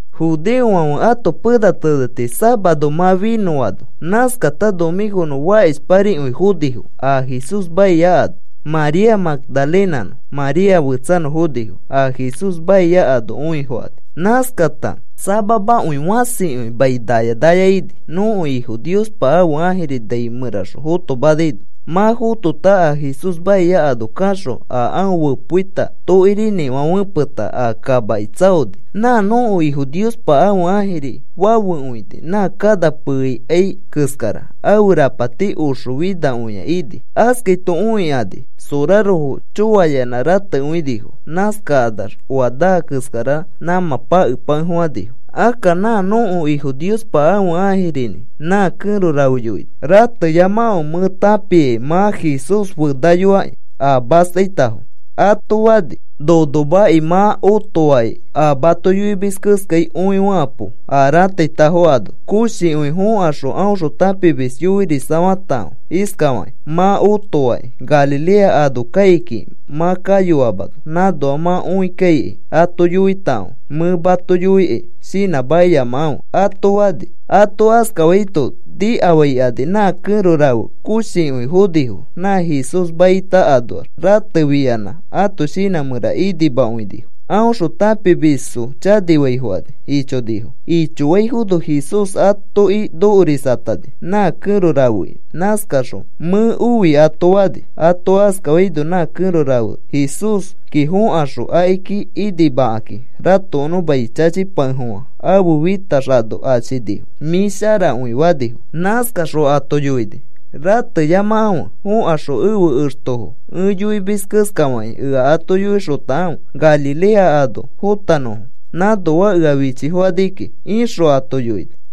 Judeofãfe ãto pena teneti safaro mã finõano, nãskata nomĩkonõ fakishparikõi fonifo a Jesús maia ano. María Magdalenanõ María fetsanõ fonifo a Jesús maia ano õifokani. Nãskata samamakõi fãsikõi mai naya naya ini, nõko Ifo Niospa ãfe ãjiri nai mẽraxõ fotomanaino. Mã fotota a Jesús maia ano kaxõ, a aõ fẽpoita tokirinĩfã fepeta a kamaki tsaoni. Nã nõko Ifo Niospa ãfe ãjiri fafekõini, nã kana peeikai keskara. Ãfe rapati oxofinakõi ini. Askaito õikani sorarofo choayanã ratekõinifo. Nãskakanax oa naa keskara nãmã pake pakefofãnifo. Akka nã nõko Ifo Niospa ãfe ãjirinĩ nã kẽro rafe yoini: “Rateyamakãfe. Mẽ tãpiakĩ mã Jesús fenaiyoaki a mastaitafo,” ato fani. “Nonomaki, mã otoaki a mato yoimis keskai. Õifekapo, a rãtaitafo ano. Koshikõi fõkaxõ aõxõ tãpimisfo yoirisafatakãfe iskafakĩ: ‘Mã otoaki. Galilea ano kai kiki mã kayoamano. Nãnoa mã õikaikai ato yoitakãfe. Mẽ mato yoikai shinãmakiyamakãfe,’” ato fani. Ato askafaito nikafaikani nã kẽro rafe koshikõi fonifo nã Jesús maita anoax. Ratefiyanã ãto shinã mẽra inimakõinifo aõxõ tãpimisfo chanifaifokani ichonifo. Ichoaifono Jesús atoki nokorisatani nã kẽro rafeki. Nãskaxõ, “Mẽ oi,” ato fani. Ato askafaino nã kẽro rafe Jesúski fõkaxõ akiki inimakakĩ ratokonõ mai chachipakefofã ãfe fitax ano achinifo. “Mĩ sharakõi,” fanifo. Nãskaxõ ato yoini: “Rateyamakãfe. Fokaxõ ẽfe extofo ẽ yoimis keska fakĩ ea ato yoixotakãfe Galilea ano fotanõfo. Nãnoa ea fichifokani kiki,” ixõ ato yoini.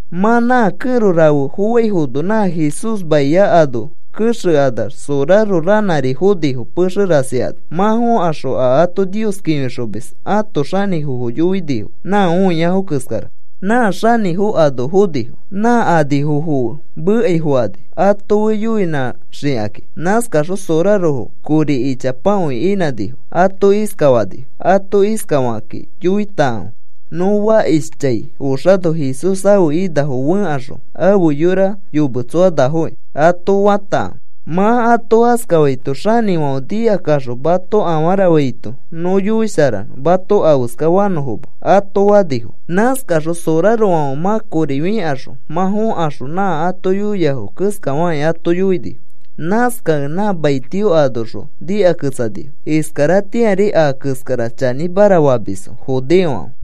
Mã nã kẽro rafe foaifono, nã Jesús maia ano kexekanax soraro ranãri fonifo pexe rasi ano. Mã fõkaxõ a ato Nios kĩfixomis ãto xanĩfofo yoinifo nã õiafo keskara. Nã xanĩfo ano fonifo. Nã anifofo fe mekai fokani, ato fe yoinãsharaxikaki. Nãskakaxõ sorarofo kori ichapakõi inãnifo. Ato iskafanifo: “Ato iskafakakĩ yoitakãfe: ‘Nõ fakishchãi oxano Jesús ãfe inafo fẽkaxõ ãfe yora yometsoanafo,’ ato fatakãfe. Mã ato askafaito xanĩfãfe nikaxõ mato afara faito, nõ yoisharanõ mato afeska fanõfoma,” ato fanifo. Nãskakaxõ sorarofãfe mã kori fĩkaxõ, mã fõkaxõ nã ato yoiafo keskafakĩ ato yoinifo. Nãskakẽ nã maitio anoxõ nikaketsanifo. Iskaratĩari a keskara chanĩmara famisfo judeofãfe.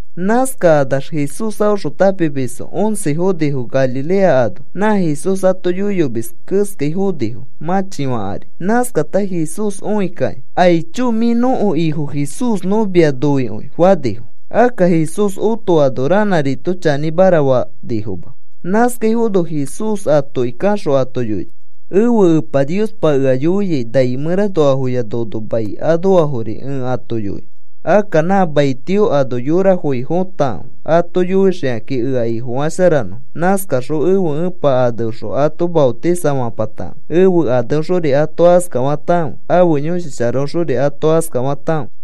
Nãskakanax Jesús aõxõ tãpimisfo once fonifo Galilea ano, nã Jesús ato yoiyomis keskai fonifo mãchifã ari. Nãskakata Jesús õikakĩ, “Aicho, mĩ nõko Ifo Jesús nõ mia noikõi,” fanifo. Akka Jesús otoano ranãrito chanĩmara fanifoma. Nãskaifono Jesús atoki kaxõ ato yoini: “Ẽfe Epa Niospa ea yoia nai mẽranoafoya nono mai anoafori ẽ ato yoinõ. Akka nã maitio ano yorafoki fotakãfe ato yoixikakĩ ea Ifofasharanõfo. Nãskaxõ ẽfe Epa aneõxõ ato maotisafapatakãfe. Ẽfe aneõxori ato askafatakãfe, ãfe Yõshi Sharaõxori ato askafatakãfe.